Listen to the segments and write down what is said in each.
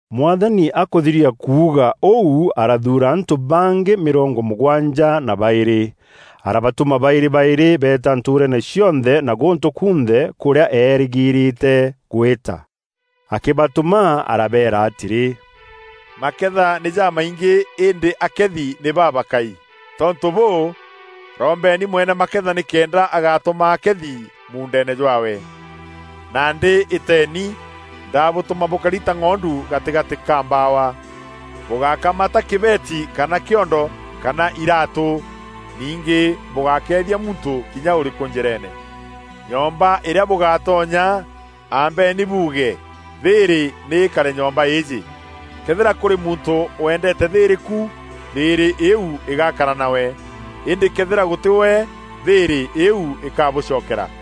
Mwathani akûthiria kuuga ûu arathuura antû bangî mîrongo mûgwanja na baîrî. Arabatûma baîrî baîrî beeta ntûûreene cionthe na gûntû kunthe, kûrîa eerîgîîrîte gwîta. Akîbatûma arabeera atîrî, “Maketha nî jamaingî îndî akethi nî babakai. Tontû bûû, rombeni mwene maketha nîkenda agatûma akethi muundeene jwaawe. Nandî îteeni, ndabûtûma bûkari ta ng'ondu gatîgatî ka mbawa. Bûgákamata kîbeeti kana kîondo, kana iraatû. Ningî bûgákeethia muntû kinya ûrîkû njîreene. Nyomba îrîa bûgatonya, ambenî buuge, ‘Thîîrî nî îkare nyomba îîjî!’ Këethîra kûrî muntû wendeete thîîrî ku, thîîrî îîu îgakara nawe, îndî këethîra gûtî we, thîîrî îîu îkabûcokera.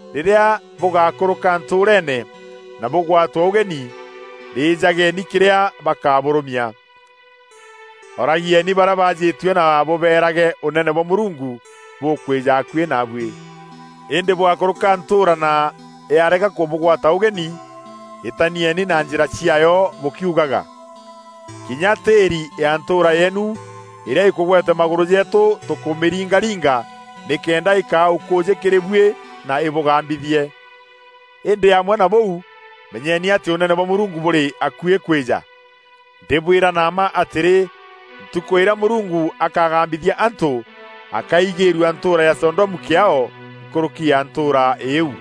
Rîrîa bûgakûrûka ntûûreene na bûgwatwe ûgeni, rîjageni kîrîa bakabûrûmia. Oragieni barîa baajîtue na bûbeerage, ‘Ûnene bwa Mûrungu bûkwîja akuî naabuî.’ Îndî bwakûrûka ntûûra na, yarega kûbûgwata ûgenî, îtanieni na njîra ciaayo bûkiugaga, ‘Kinya tîîri ya ntûûra yeenu îrîa îkûgwete magûrû jeetû tûkûmîringaringa nîkenda îkaa ûkûûjî kîrî buî na îbûgambithie. Îndî amwe na bûu, menyeni atî Ûnene bwa Mûrungu bûrî akuî kwîja!’ Ndîbwîra na mma atîrî, ntûkû îrîa Mûrungu akagambithia antû, akaigîîrua ntûûra ya Sodomu kîaao nkûrûki ya ntûûra îîu.”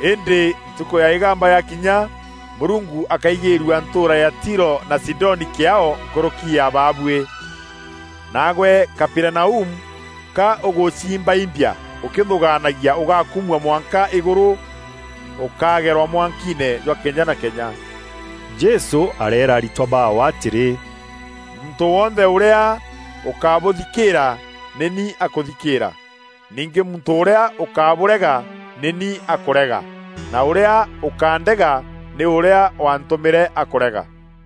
Îndî ntukû ya îgamba yakinya Mûrungu akaigîrua ntûûra ya Tiro na Sidoni kîaao nkûrûki ya baabuî. Naagwe Kaperinaumu ka ûgûciimbaimbia ûkîthûgaanagia ûgakumua mwanka îgûrû? Ûkageerwa mwankiine jwa kenya na kenya.” Jesû areera aritwa baawe atîrî, “Muntû wonthe ûrîa ûkabûthikîîra, nî ni akûthikîîra. Ningî muntû ûrîa ûkabûrega nî ni akûrega, na ûrîa ûkandega, nî ûrîa waantûmîre akûrega.”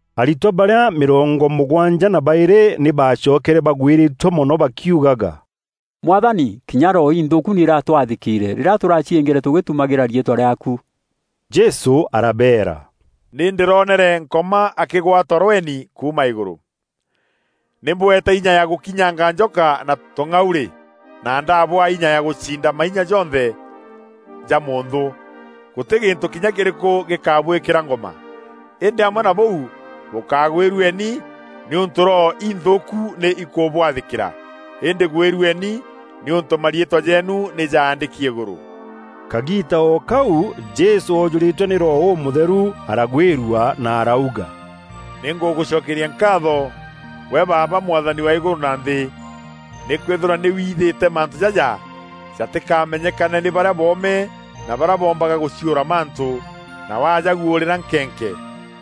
Aritwa barîa mîrongo mûgwanja na baîrî nî baacokere bagwîrîtue mono bakiugaga, “Mwathani, kinya roho inthûûku nî iratwathîkîîre rîrîa tûraciîngîre tûgîtumagîra riîtwa rîaaku.” Jesû arabeera, “Nî ndîronere Nkoma akîgwa ta rweni kuuma îgûrû. Nî mbûeete inya ya gûkinyanga njoka na tûng'aurî, na ndaabûaa inya ya gûciinda mainya jonthe ya mûnthû. Gûtî gîntû kinya kîrîkû gîkabwîkîra ngûma. Îndî amwe na bûu bûkagwîrueni nîûntû roho inthûûku nî ikûbwathîkîra, îndî gwîrueni nîûntû mariîtwa jeenu nî jaandîki îgûrû.” Kagiiita o kau Jesû oojûrîtwe nî Roho Ûmûtheru, aragwîrua na arauga, “Nî ngûgûcokeria nkaatho gwe Baaba, Mwathani wa îgûrû na nthî, nîkwîthîrwa nî withîte mantû jaja jatîkamenyekane nî barîa boome na barîa boombaga gûciûra mantû, na wajaguûrîra nkenke.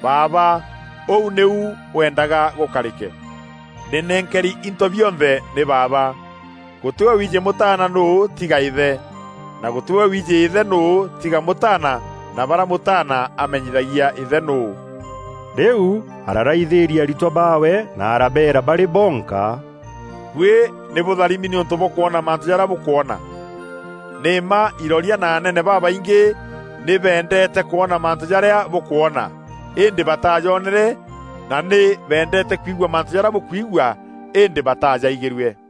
Baaba, ûu nîu weendaga gûkarîke. “Nî nenkeri into bionthe nî Baaba. Gûtî we wiijî Mûtaana nûû tiga Îthe, na gûtî we wiijî Îthe nûû tiga Mûtaana na barîa mûtaana amenyithagia Îthe nûû.” Rîu araraithîria aritwa baawe na arabeera barî bonka, “Buî nî bûtharimi nîûntû bwa kwona mantû jarîa bûkwona! Nî mma iroria na anene babaingî nî beendeete kwona mantû jarîa bûkwona, îndî bataajonere, na nî beendeete kwigua mantû jarîa bûkwigua, îndî batajaigîrue.”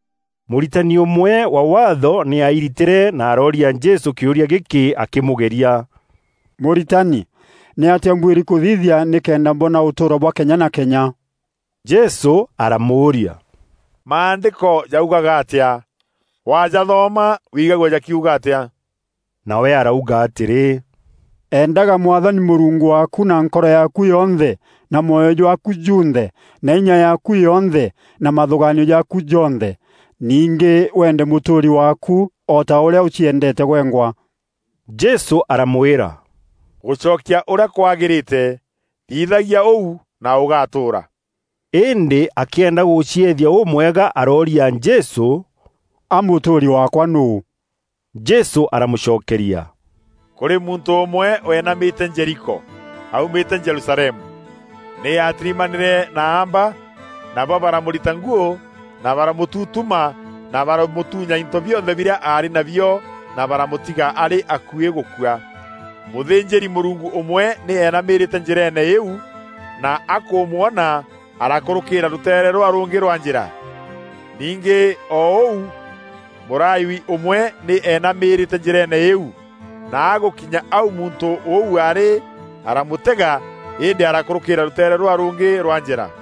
Mûritani ûmwe wa Waatho nî aairitîre na arooria Jesû kîûria gîkî akîmûgeria, “Mûritani, nîatîa mbuîri kûthithia nîkenda mbona ûtûûro bwa kenya na kenya?” Jesû aramûûria, “Maandîko jaugaga atîa? Wajathoma wigagua jakiuga atîa?” Nawe arauga atîrî, “Endaga Mwathani Mûrungu waaku na nkoro yaaku yonthe, na mwoyo jwaaku junthe, na inya yaaku yonthe, na mathûgaanio jaaku jonthe. Ningî weende mûtûûri waaku o ta ûrîa ûciendeete gwengwa.” Jesû aramwîra, “Ûgûcokia ûrîa kwagîrîte. Thithagia ûu, na ûgatûûra.” Îndî akîenda gûcieethia ûmwega arooria Jesû, “A mûtûûri waakwa nûû?” Jesû aramûcokeria, “Kûrî muntû ûmwe weenamîte Jeriko, aumîte Jerusalemu. Nî aatirimanîre na aamba, nabo baramûrita nguû na baramûtutuma na baramûtuunya into bionthe birîa aarî nabio, na baramûtiga arî akuî gûkua. Mûthînjîri-Mûrungu ûmwe nî eenamîrîte njîreene îîu, na akûmwona arakûrûkîîra rûteere rûrîa rûngî rwa njîra. Ningî o ûu Mûlawi ûmwe nî eenamîrîte njîreene îîu, na agûkinya au muntû ûu aarî, aramûtega îndî arakûrûkîîra rûteere rûrîa rûngî rwa njîra.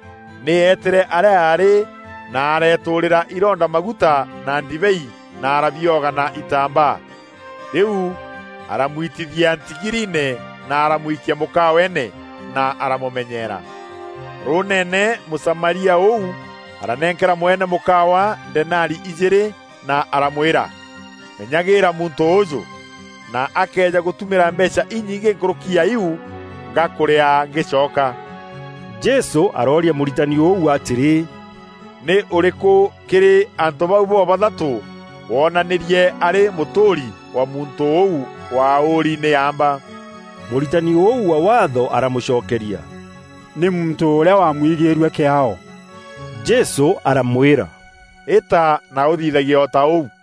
Nî eetîre arîa aarî na areetûrîria ironda maguta na ndibei na arabioga na itambaa. Rîu aramwitithia ntigiriine na aramwikia mûkaweene, na aramûmenyeera. Rûûneene Mûsamaria ûu aranenkera mwene mûkawa denari ijîîrî na aramwîra, ‘Menyagîîra muntû ûûjû, na akeeja gûtumîra mbeecha inyingî nkûrûki ya iu, ngakûrîaa ngîcoka.’” Jesû arooria mûritani ûu atîrî, “Nî ûrîkû kîrî antû bau bo-bathatû woonanîrie arî mûtûûri wa muntû ûu waaûri nî aamba?” Mûritani ûu wa Waatho aramûcokeria, “Nî muntû ûrîa waamwigîîrue kîaao.” Jesû aramwîra, “Îta na ûthithagie o ta ûu.”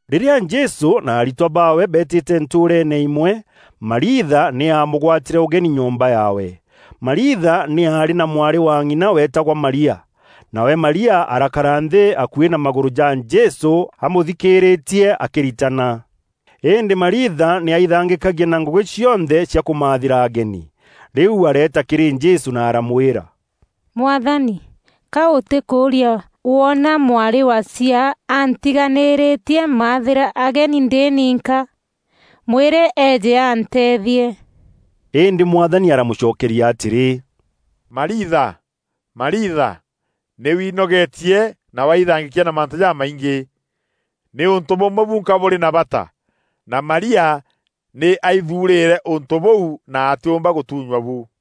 Rîrîa Jesû na aritwa baawe beetîte ntûûreene îmwe, Mariitha nî aamûgwatîre ûgeni nyomba yaawe. Mariitha nî aarî na mwarî wa ng'ina weetagwa Maria. Nawe Maria arakara nthî akuî na magûrû ja Jesû amûthikîîrîtie akîritana. Îndî Mariitha nî aithangîîkagia na ngûgî cionthe cia kûmathîra ageni. Rîu areeta kîrî Jesû na aramwîra, “Mwathani, ka ûtîkûûria woona mwarî wa chiaa antiganîritie maathîra ageni ndî ninka? Mwîre eeje anteethie.” Îndî Mwathani aramûcokeria atîrî, “Mariitha, Mariitha, nî winogeetie na waithangîkia na mantû jamaingî. Nî ûntû bûmwe bunka bûrî na bata, na Maria nî aithuurîre ûntû bûu na atîûmba gûtunywa bu.”